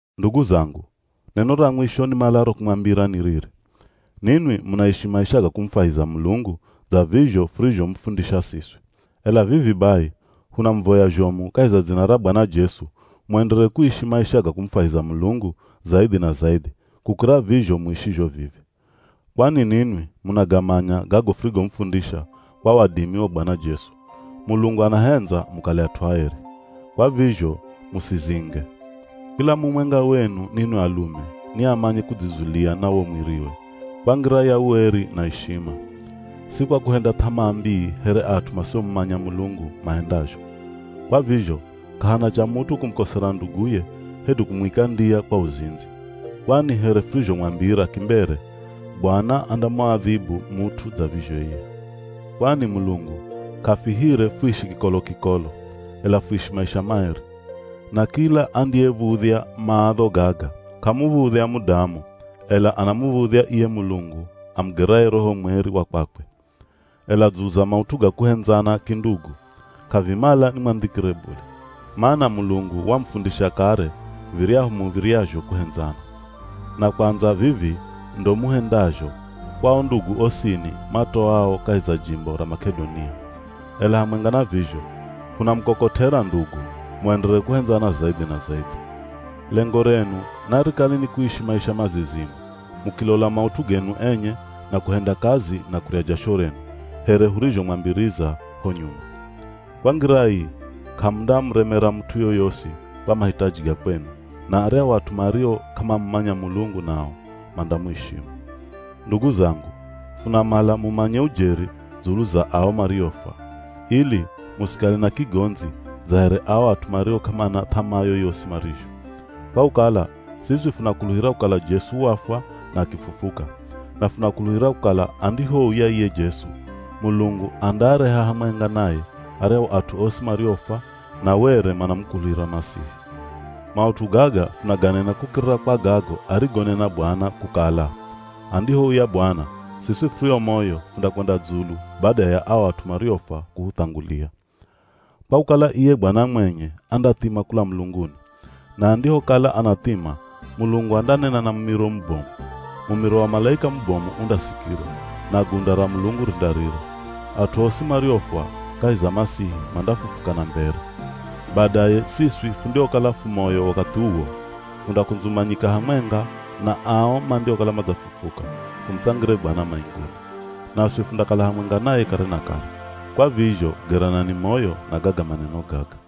Ndugu zangu, neno ra mwisho nimalaro kumwambira ni riri: Ninwi munaishi maisha ga kumufwahiza Mulungu dza vizho furizhomufundisha siswi. Ela vivi bai hunamuvoya zhomu kahi za dzina ra Bwana Jesu muenderere kuishi maisha ga kumufwahiza Mulungu zaidhi na zaidhi kukira vizho muishizho vivi. Kwani ninwi munagamanya gago furigomufundisha kwa wadimi wa Bwana Jesu. Mulungu anahendza mukale at'u aeri. Kwa vizho musizinge. Kila mumwenga wenu ninwi alume ni amanye kudzizulia na wo mwiriwe, kwa ngira ya ueri na ya ishima. Si kwa kuhenda th'amaa mbii here at'u masiomumanya Mulungu mahendazho. Kwa vizho, k'ahana cha mut'u kumukosera nduguye hedu kumwika ndiya kwa uzindzi. Kwani here furizhomwambira kimbere Bwana andamuadhibu mut'u dza vizho iye. Kwani Mulungu k'afihire fuishi kikolo-kikolo, ela fuishi maisha maeri. Na kila andiyev̱udhya maadho gaga, k'amuv̱udhya mudamu, ela anamuv̱udhya iye Mulungu amugeraye Roho mweri wa kwakwe. Ela dzulu za maut'u ga kuhendzana kindugu, k'avimala ni mwandhikire bule. Mana Mulungu wamufundisha kare viryahu muv̱iryazho kuhendzana. Na kwandza vivi ndo muhendazho kwa o ndugu osini matoao kahi za jimbo ra Mak'edonia. Ela hamwenga na vizho, hunamukokot'era ndugu muenderere kuhendzana zaidhi na zaidhi. Lengo renu narikale ni kuishi maisha mazizimu, mukilola maut'u genu enye na kuhenda kazi na kurya jasho renu, here hurizhomwambiriza ho nyuma. Kwa ngira ii k'amundamuremera mut'u yoyosi kwa mahitaji ga kwenu, na aryahu at'u mario k'amamumanya Mulungu nao mandamuishimu. Ndugu zangu, funamala mumanye ujeri dzulu za ao mariofwa, ili musikale na kigondzi dza here ao at'u mario k'amana th'amaa yoyosi marizho. Kwa kukala siswi funakuluhira kukala Jesu wafwa na akifufuka. Na funakuluhira kukala andihouya iye Jesu, Mulungu andaareha hamwenga naye aryahu at'u osi mariofwa na were manamukuluhira Masihi. Maut'u gaga funaganena kukirira kwa gago arigonena Bwana, kukala; andihouya Bwana, siswi furio moyo fundakwenda dzulu bada ya ao at'u mariofwa kuhuthangulia. Kwa kukala iye Bwana mwenye andathima kula mulunguni. Na andihokala anathima Mulungu andanena na mumiro mubomu. Mumiro wa malaika mubomu undasikirwa, na gunda ra Mulungu rindarira. At'u osi mariofwa kahi za Masihi mandafufuka na mbere. Badaye siswi fundiokala fu moyo wakathi uwo, fundakundzumanyika hamwenga na ao mandiokala madzafufuka, fumutsangire Bwana mainguni. Naswi fundakala hamwenga naye kare na kare. Kwa vizho geranani moyo na gaga maneno gaga.